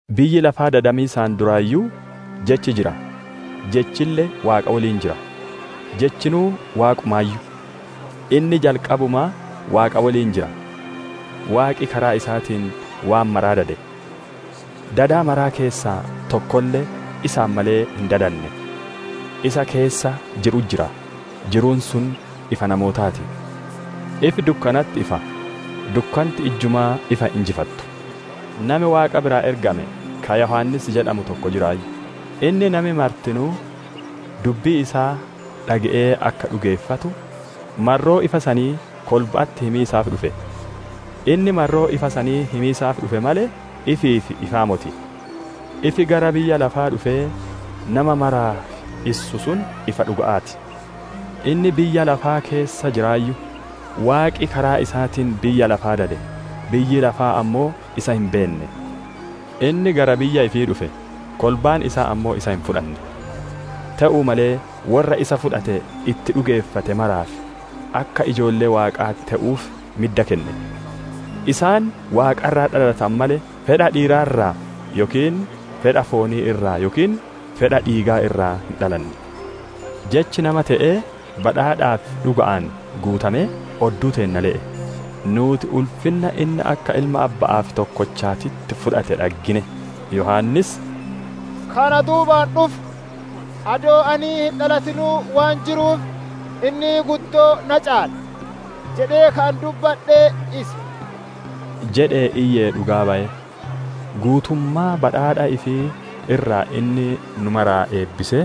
Biyyi lafaa dadamiisaan duraayyuu, Jechi jira; Jechille Waaqa woliin jira; Jechinuu Waaqumaayyu. Inni jalqabumaa Waaqa woliin jira. Waaqi karaa isaatiin waan maraa dade; dada maraa keessaa tokkolle isaan malee hin dadanne. Isa keessa jiru'utti jira; jiruun sun ifa namootaa ti. Ifi dukkanatti ifa; dukkanti ijjumaa ifa hin injifattu. Nami Waaqa biraa ergame, ka Yohaannis jedhamu tokko jiraayyu. Inni nami martinuu dubbii isaa dhage'ee akka dhugeeffatu, marroo ifa sanii kolba'atti himiisaaf dhufe. Inni marroo ifa sanii himiisaaf dhufe malee, ifiif ifaa moti. Ifi gara biyya lafaa dhufee nama maraaf issu sun ifa dhuga'aa ti. Inni biyya lafaa keessa jiraayyu; Waaqi karaa isaatiin biyya lafaa dade; biyyi lafaa ammoo isa hin beenne. Inni gara biyya ifii dhufe; kolbaan isaa ammoo isa hin fudhanne. Te'uu malee, worra isa fudhatee itti dhugeeffate maraaf, akka ijoollee Waaqaa te'anuuf midda kenne. Isaan Waaqa irraa dhalatane malee, fedha dhiiraa irraa yookiin fedha foonii irraa yookiin fedha dhiigaa irraa hin dhalanne. Jechi nama te'ee, badhaadhaa fi dhuga'aan guutamee, odduu teenna le'e. Nuuti ulfinna inni akka Ilma Abba'aaf tokkochaatitti fudhate dhaggine. Yohaannis, « ‹Ka ana duubaan dhufu, adoo ani hin dhalatinuu waan jiruuf, inni guddoo na caala› jedhee ka ani dubbadhe isa» jedhee iyyee dhugaa baye. Guutummaa badhaadha ifii irraa inni nu maraa eebbisee,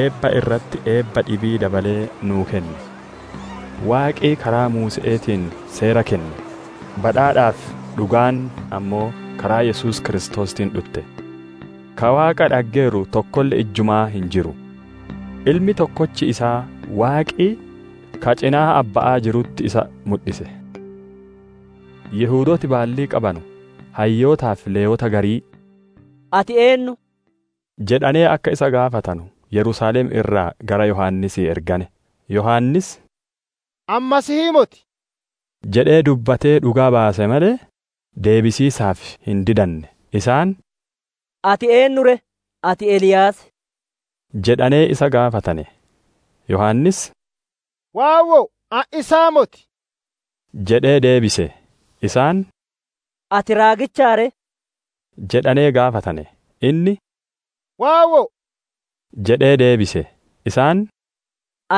eebba irratti eebba dhibii dabalee nuu kenne. Waaqi karaa Muuse'eetiin seera kenne; badhaadhaa fi dhugaan ammoo karaa Yesuus Kiristoosiitiin dhutte. Ka Waaqa dhaggeeru tokkolle ijjumaa hin jiru. Ilmi tokkochi isaa Waaqi, ka cinaa Abba'aa jirutti isa mudhise. Yihudooti baallii qabanu hayyootaa fi Lewwoota garii, «Ati eennuu?» jedhanee akka isa gaafatanu Yerusaalem irraa gara Yohaannisii ergane. Yohaannis, «Ani Masiihii moti» jedhee dubbatee dhugaa baase malee, deebisiisaaf hin didanne. Isaan, «Ati eennu ree? Ati Eliyaasii» jedhanee isa gaafatane. Yohaannis, «Waawwoo ani isaa moti» jedhee deebise. Isaan, «Ati Raagichaa ree» jedhanee gaafatane. Inni, «Waawwoo» jedhee deebise. Isaan,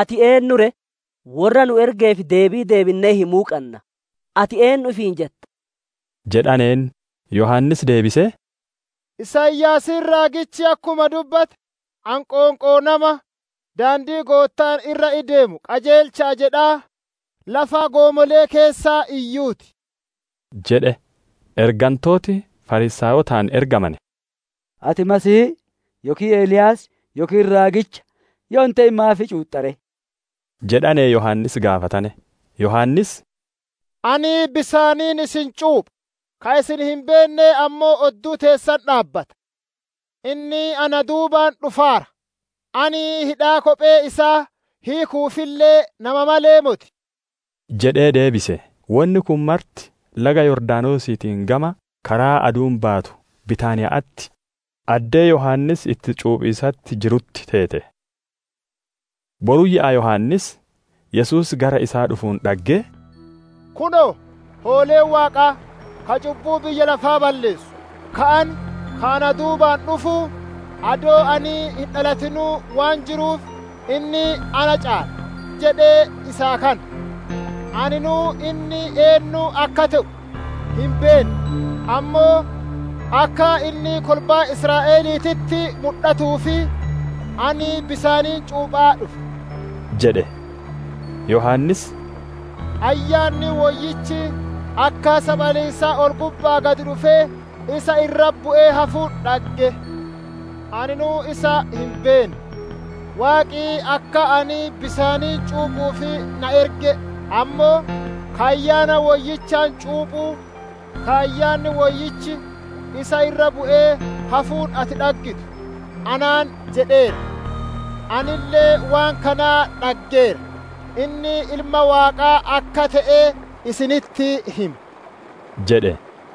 «Ati eennu ree? Worra nu ergeef deebii deebinnee himuu qanna. Ati eennu ifiin jetta?» jedhaneen. Yohaannis deebisee, «Isaayaasiin raagichi akkuma dubbate, ani ‹Qoonqoo nama daandii Goottaan irra ideemu qajeelcha'a› jedhaa, lafa goomole'ee keessaa iyyuu ti» jedhe. Ergantooti Fariisaayotaan ergamane, «Ati Masiihii yookiin Eliyaas yookiin Raagicha yoo hin te'in maaf cuuxxa ree?» jedhanee Yohaannis gaafatane. Yohaannis, «Ani bisaaniin isin cuupha, ka isin hin beenne ammoo odduu teessan dhaabbata. Inni na duubaan dhufaara; ani hidhaa kophee isaa hiiku'uufille nama malee moti» jedhee deebise. Wonni kun marti laga Yordaanosiitiin gama karaa aduun baatu Bittaaniya'atti, addee Yohaannis itti cuuphiisatti jirutti teete. Boruyyaa Yohaannis, Yesuus gara isaa dhufuun dhaggee, «Kunoo! Hooleen Waaqaa, ka cubbuu biyya lafaa balleessu. Ka ani, ‹Ka ana duubaan dhufu, adoo ani hin dhalatinuu waan jiruuf, inni na caala› ka ani jedhe isaa kana. Aninuu inni eennu akka te'u hin beenne; ammoo akka inni kolbaa Israa'eliititti mudhatuuf, ani bisaaniin cuuphaa dhufe» jedhe. Yohaannis dhugaa bayee, «Ayyaanni Woyyichi akka saphaliisaa ol-gubba'aa gad dhufee isa irra bu'ee hafuun dhaggeera. Aninuu isa hin beenne, Waaqi akka ani bisaaniin cuuphuuf na erge ammoo, ‹Ka Ayyaana Woyyichaan cuuphu, Ka Ayyaanni Woyyichi isa irra bu'ee hafuun ati dhaggitu› anaan jedheera. Anille waan kana dhaggeera, inni Ilma Waaqaa akka te'e isinitti hima» jedhe.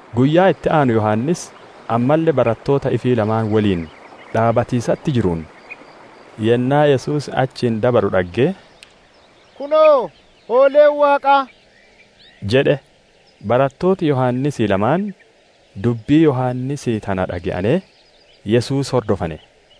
Guyyaa itti aanu Yohaannis ammalle barattoota ifii lamaan woliin dhaabbatiisatti jiruun, yennaa Yesuus achiin dabaru dhaggee, «Kunoo, hooleen Waaqaa!» jedhe. Barattooti Yohaannisii lamaan dubbii Yohaannisii tana dhage'anee, Yesuus hordofane.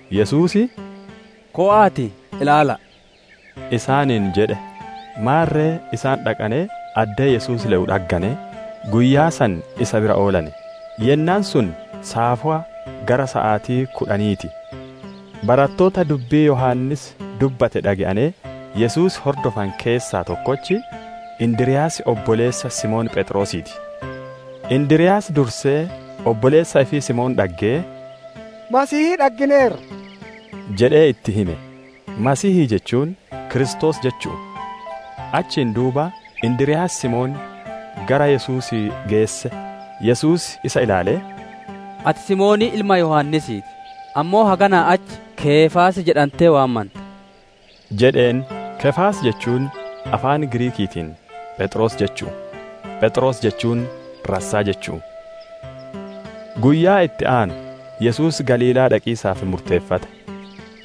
Yesuus, «Kowa'aatii ilaala'a!» isaaniin jedhe. Maarre isaan dhaqanee addee Yesuus le'u dhagganee, guyyaa san isa bira oolane; yennaan sun saafowa gara saatii kudhanii ti. Barattoota dubbii Yohaannis dubbate dhage'anee Yesuus hordofane keessaa tokkochi, Indiryaasii obboleessa Simoon Pheexroosii ti. Indiryaas dursee obboleessa ifii Simoon dhaggee, «Masiihii dhaggineerra» jedhee itti hime; «Masiihii» jechuun, «Kiristoos» jechu'u. Achiin duuba Indiryaas Simoon gara Yesuusii geesse. Yesuus isa ilaalee, «Ati Simoonii ilma Yohaannisii ti; ammoo haganaa achi, ‹Keefaas› jedhantee waamanta» jedheen; «Keefaas» jechuun afaan Giriikiitiin, «Pheexroos» jechu'u; Pheexroos jechuun, «Rassaa» jechu'u. Guyyaa itti aanu Yesuus Galiilaa dhaqiisaaf murteeffate.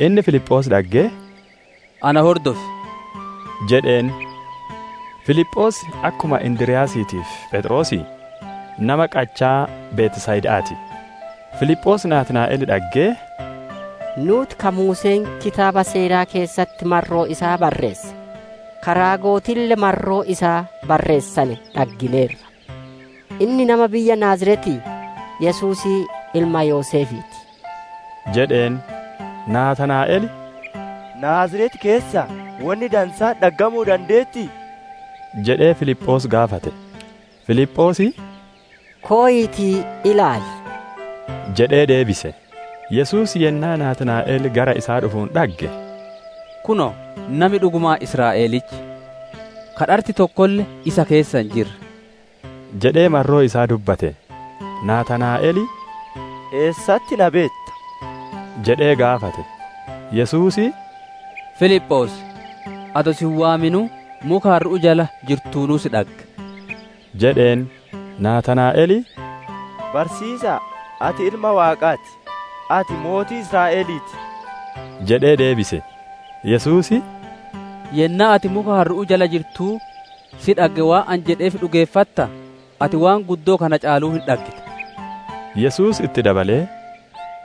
Inni Filiphoos dhaggee, «Ana hordofi!» jedheen. Filiphoos akkuma Indiryaasiitii fi Pheexroosii, nama qachaa Betsayda'aa ti. Filiphoos Naataanaa'el dhaggee, «Nuuti ka Muuseen kitaaba seeraa keessatti marroo isaa barreesse, ka raagotille marroo isaa barreessane dhaggineerra. Inni nama biyya Naaziretii, Yesuusii ilma Yoseefii ti» jedheen. Naataanaa'el, «Naaziret keessaa wonni dansaan dhaggamuu dandeettii?» jedhee Filiphoos gaafate. Filiphoos, «Koyiitii ilaali!» jedhee deebise. Yesuus yennaa Naataanaa'el gara isaa dhufuun dhagge, «Kunoo, nami dhugumaan Israa'elichi, ka dharti tokkolle isa keessa hin jirre!» jedhee marroo isaa dubbate. Naataanaa'el, «Eessatti na beetta?» jedhee gaafate. Yesuus, «Filiphoos adoo si hin waaminuu, muka harru'uu jala jirtuunuu si dhagge» jedheen. Naataanaa'el, «Barsiisa'a, ati Ilma Waaqaa ti! Ati mootii Israa'elii ti!» jedhee deebise. Yesuus, «Yennaa ati muka harru'uu jala jirtuu si dhagge waan ani jedheef dhugeeffataa? Ati waan guddoo kana caaluu hin dhaggita» jedhe. Yesuus itti dabalee,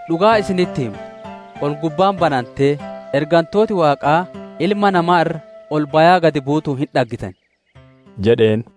«Dhugaa isinitti hima: Ol-gubbaan banantee, ergantooti Waaqaa Ilma Namaa irra ol bayaa gad buutuun hin dhaggitan» jedheen.